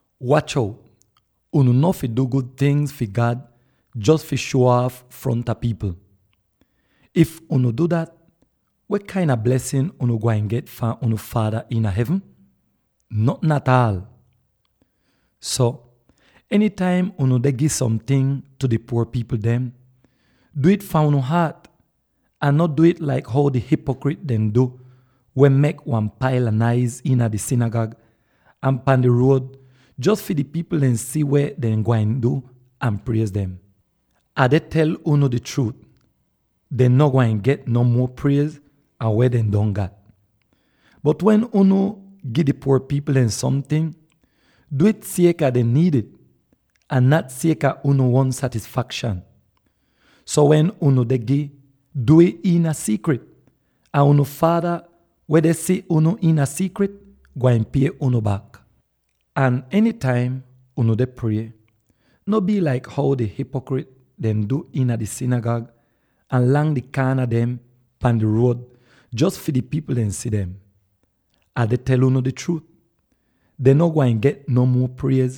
“Wach out, unu no fi du gud tingz fi God jos fi shuo aaf fronta pipl. If unu du dat, weh kain a blesin unu gwain get fahn unu Faada iina hevn? Notn ataal! “So enytaim unu deh gi somting tu di puor pipl dem, du'ih fahn unu haat, ahn no du'ih laik how di hipokrit dehn du weh mek wan paila naiz iina di sinigag ahn pan di ruod jos fi di pipl dehn si weh dehn gwain du ahn priez dem. Ah deh tel unu di chruut: dehn no gwain get no muo priez an weh dehn don gat! Bot wen unu gi di puor pipl dem somting, du'ih sieka dehn niid ih, ahn no sieka unu uon satisfakshan. So wen unu deh gi, du'ih iina siikrit, ahn unu Faada weh deh si unu iina siikrit, gwain pie unu bak. “Ahn enytaim unu deh prie, no bii laik how di hipokrit dehn du iina di sinigag ahn lang di kaana dem pan di ruod jos fi di pipl dehn si dem. Ah deh tel unu di chruut: dehn no gwain get no muo priez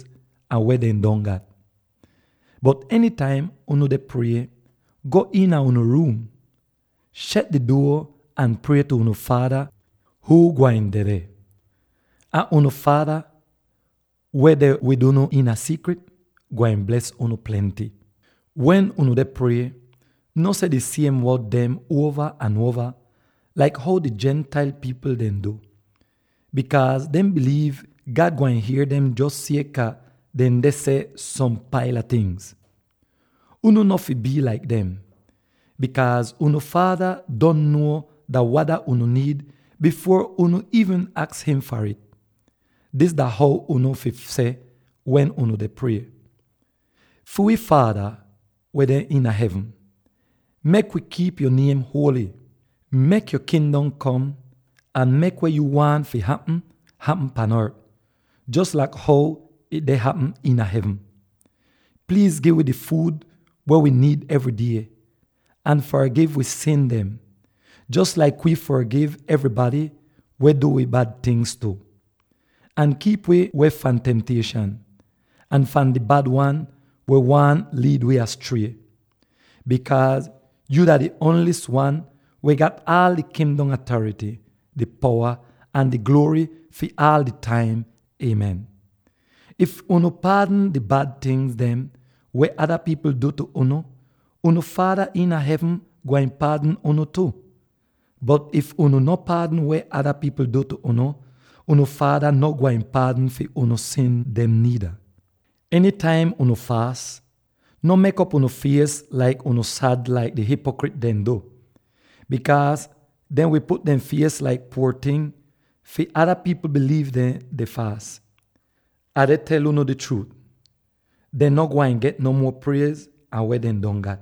an weh dehn don gat! Bot enytaim unu deh prie, go iina unu ruum, shet di duo ahn prie tu unu Faada huu gwain dedeh. Ahn unu Faada, weh deh wid unu iina siikrit, gwain bles unu plenty. “Wen unu deh prie, no seh di siem wod dem uova ahn uova laik how di Gentile pipl dehn du, bikaaz dehn biliiv God gwain hier dem jos sieka dehn deh seh som paila ting. Unu no fi bii laik dem, bikaaz unu Faada don nuo dah wada unu niid bifuor unu iivn aks im far ih. Dis dah how unu fi seh wen unu deh prie: ‘Fi wi Faada weh deh iina hevn, mek wi kiip yo niem huoly. Mek yo Kingdom kom, ahn mek weh yuu waahn fi hapm, hapm pan ort, jos laik how ih deh hapm iina hevn. Pliiz gi wi di fuud weh wi niid evry die, ahn fargiv wi sin dem, jos laik wii fargiv evrybady weh du wi bad tingz tu. Ahn kiip wi weh fahn temtieshan, ahn fahn di Bad Wan weh waahn liid wi astrie. [Bikaaz yu dah di ongli'is wan weh gat aal di Kingdom atarity, di powa ahn di gluory fi aal di taim, Amen!]’ “If unu paadn di bad tingz weh ada pipl du tu unu, unu Faada iina hevn gwain paadn unu tu. Bot if unu no paadn weh ada pipl du unu, unu Faada no gwain paadn fi unu sin dem niida. “Enytaim unu faas, no mek'op unu fies laik if unu sad laik di hipokrit dehn du. Bikaaz dehn wi put dehn fies laik puor ting fi ada pipl biliiv dehn deh faas. Ah deh tel unu di chruut: dehn no gwain get no muo priez an weh dehn don gat!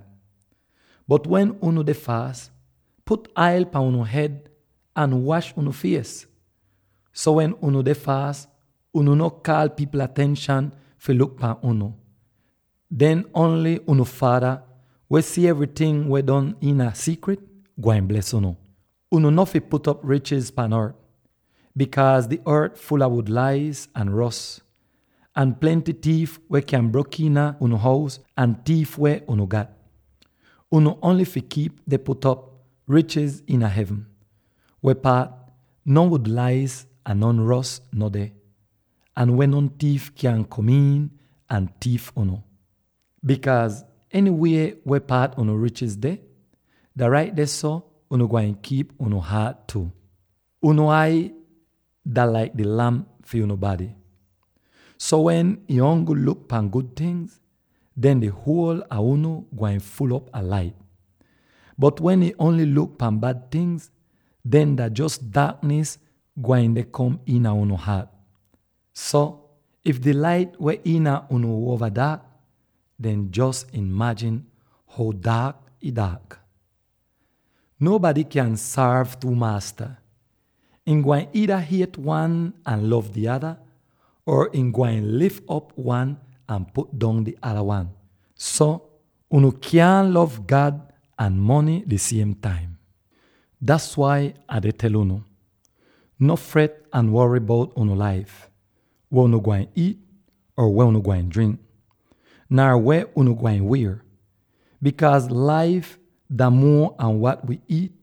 Bot wen unu deh faas, put ail pan unu hed ahn wash unu fies, so wen unu deh faas, unu no kaal pipl atenshan fi luk pahn unu. Den ongl unu Faada weh si evryting weh don iina siikrit gwain bles unu. “Unu no fi put'op richiz pan ort, bikaaz di ort ful a wud-lais ahn ros, ahn plenty tiif weh kyan brok iina unu hous ahn tiif weh unu gat. Unu ongl fi kiip deh put'op richiz iina hevn, weh paat non wud-lais ahn non ros no deh, ahn weh non tiif kyaahn kom iin ahn tiif unu. Bikaaz enywie weh paat unu richiz deh, dah rait dehso unu gwain kiip unu haat tu. “Unu ai dah laik di lamp fi unu bady. So, wen ih ongl luk pan gud tingz, den di huol a unu gwain ful'op a lait. Bot wen ih ongl luk pan bad tingz, den dah jos daaknis gwain deh kom iina unu haat. So, if di lait weh iina unu uova daak, den jos imajin how daak ih daak! “Nonbady kyaahn sorv two maasta. Ihn gwain iida hiet wan ahn lov di ada, or ihn gwain lif op wan ahn put dong di ada wan. So, unu kyaahn lov God ahn mony di siem taim. “Das wai Ah deh tel unu: no fret ahn wory bout unu laif, weh unu gwain iit or weh unu gwain drink, nar weh unu gwain wier, bikaaz laif dah muo an wat wi iit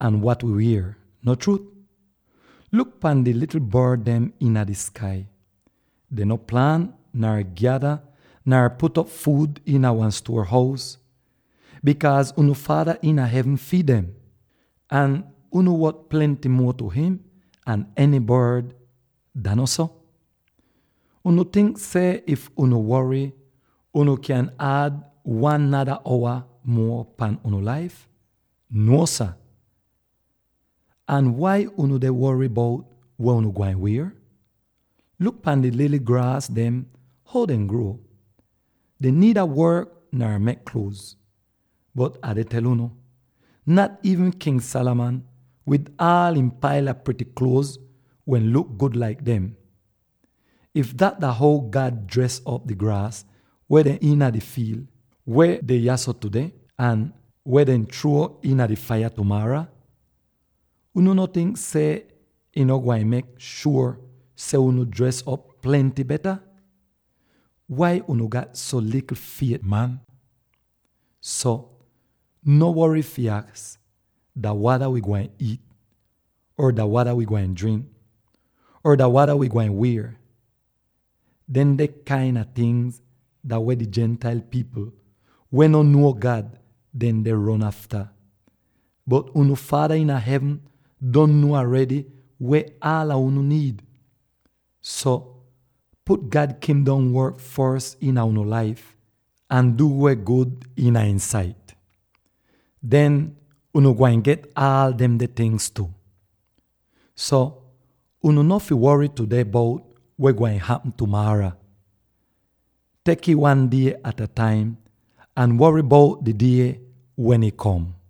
ahn wat wi wier, no chruut? Luk pan di likl bord dem iina di skai; dehn no plaant nar gyada nar put'op fuud iina wan stuor-hous, bikaaz unu Faada iina hevn fiid dem. Ahn unu wot plenty muo tu im an eny bord, dah no so? Unu tink seh if unu wory, unu kyan ad aan wan nada owa muo pan unu laif? Nuo, sah! “Ahn wai unu deh wory bout weh unu gwain wier? Luk pan di lily graas dem how dehn gruo. Dehn niida work nar mek kluoz; bot Ah deh tel unu: nat iivn King Solomon, wid aal ihn paila prity kluoz wehn luk gud laik dem. If dat dah how God dres op di graas weh deh iina di fiil, weh deh yahso tudeh, ahn weh dehn chruo iina di faiya tumaara, unu no tink seh ihn no gwain mek shuor seh unu dres op plenty beta? Wai unu gat so likl fiet, man? “So, no wory fi aks, ‘Dah wada wi gwain iit?’ or ‘Dah wada wi gwain drink?’ or ‘Dah wada wi gwain wier?’ Demde kain a tingz dah weh di Gentile pipl, weh no nuo God, dehn deh ron afta. Bot unu Faada iina hevn don nuo aredy weh aala unu niid. So, put God Kingdom work fos iina unu laif, ahn du weh gud iina ihn sait; den unu gwain get aal demde tingz tu. So, unu no fi wory tudeh bout weh gwain hapm tumaara. Tek'ih wan die at a taim ahn wory bout di die wen ih kom.